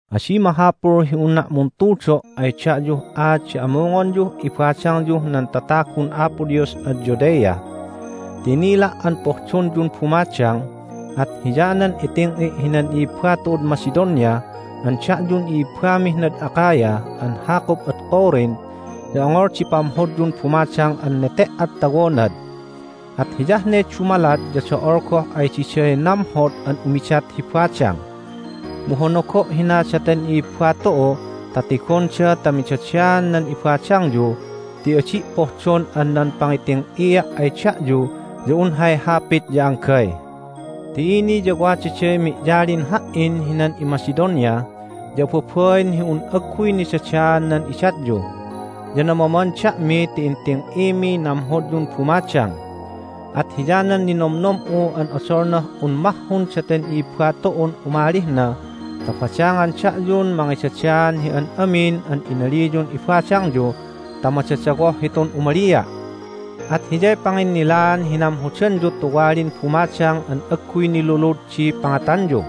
Adi mahapul hi unna' muntudo' ay da'yuh aat di amungonyuh ibadangyuh nan tatagun Apo Dios ad Judea. Ti inila' an pohdonyun bumadang, at hiyanan iting'i' hinan i'ibba tu'ud Macedonia an da'yun i'ibbamih nad Achaia an hakup ad Corinth ya ongol di pamhodyun bumadang an nete"ad tawonad, at hiyah ne dumalat ya do'ol goh ay diday namhod an umidat hi badang. Mu honogo' hina daten i'ibba tu'u ta tigonda ta midadaan nan ibadangyu ti adi' pohdon an nan pangiting'ia' ay da'yu ya un hay hapit ya anggay. Ti ini ya wadaday mi'yalin ha"in hinan iMacedonia, ya ababain hi un agguy nidadaan nan idatyu! Ya namaman da'mi ti inting'imiy namhodyun bumadang. At hiyanan ninomnom'u an odolnah un mahhun daten i'ibba tu'un umalih na ta badangan da'yun mangidadaan hi an amin an inaliyun ibadangyu ta madadawoh hitun umalia'. At hiyay panginnilaan hi namhodanyu tuwalin bumadang an agguy nilulud di pangatanyu.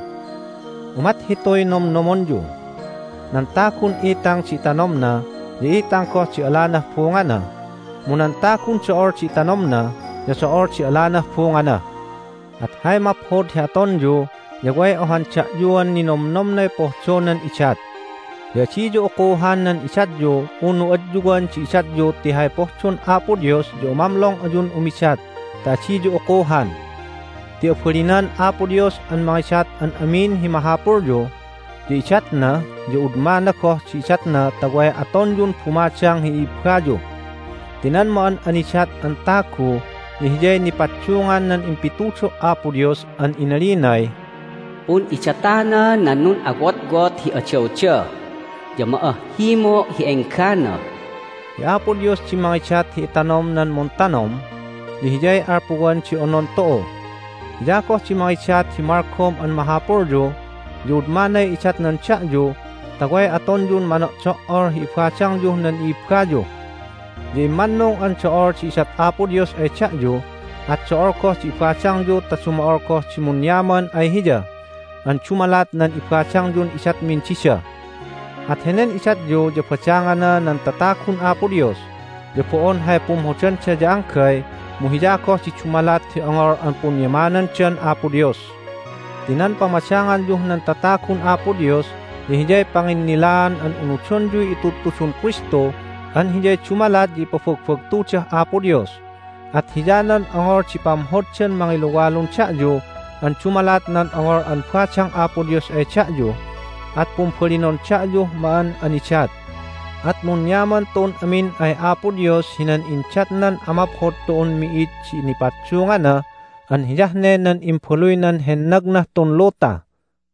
Umat hituy nomnomonyu: "Nan tagun itang di itanomna ya itang goh di alanah bungana, mu nan tagun do'ol di itanomna ya do'ol di alanah bungana." At hay maphod hi atonyu ya way ohan da'yuan ninomnomnay pohdonan idat. Ya adiyu ukuhan nan idatyu unu adyuwan di idatyu ti hay pohdon Apo Dios ya umamlong ayun umidat ta adiyu ukuhan. Ti abalinan Apo Dios an mangidat an amin hi mahapulyu, ya idatna, ya udmana goh di idatna ta way atonyun bumadang hi i'ibbayu. Ti nan ma'an'anidat an tagu ya hiyay nipaddungan nan impitudo' Apo Dios an inalinay, "Pun'idatana nan nun'awotwot hi adawda, ya ma'ahhimo' hi enggana." Hi Apo Dios di mangidat hi itanom nan muntanom, ya Hiyay alpuwan di onon tu'u. Hiya goh di mangidat hi malgom an mahapulyu, ya udmanay idatnan da'yu ta way atonyun mano'do"ol hi ibadangyuh nan i'ibbayu. Ya immannung an do'ol di idat Apo Dios ay da'yu, at do'ol goh di ibadangyu ta dumo'ol goh di munyaman ay Hiya an dumalat nan ibadangyun idatmin dida. At henen idatyu ya badangana nan tatagun Apo Dios, ya bo'on hay pumhodanda ya anggay mu hiya goh di dumalat hi ongol an punyamanandan Apo Dios. Ti nan pamadanganyuh nan tatagun Apo Dios ya hiyay panginnilaan an unudonyuy itudtudun Kristu an hiyay dumalat ya ipabagbagtudah Apo Dios. At hiyanan ongol di pamhoddan mangiluwalun da'yu an dumalat nan ongol an badang Apo Dios ay da'yu, at pumbalinon da'yuh ma'an'anidat. At munyaman tu'un amin ay Apo Dios hinan indatnan amaphod tu'un mi'id di nipaddungana an hiyah ne nan Imbaluynan hennagnah tun luta!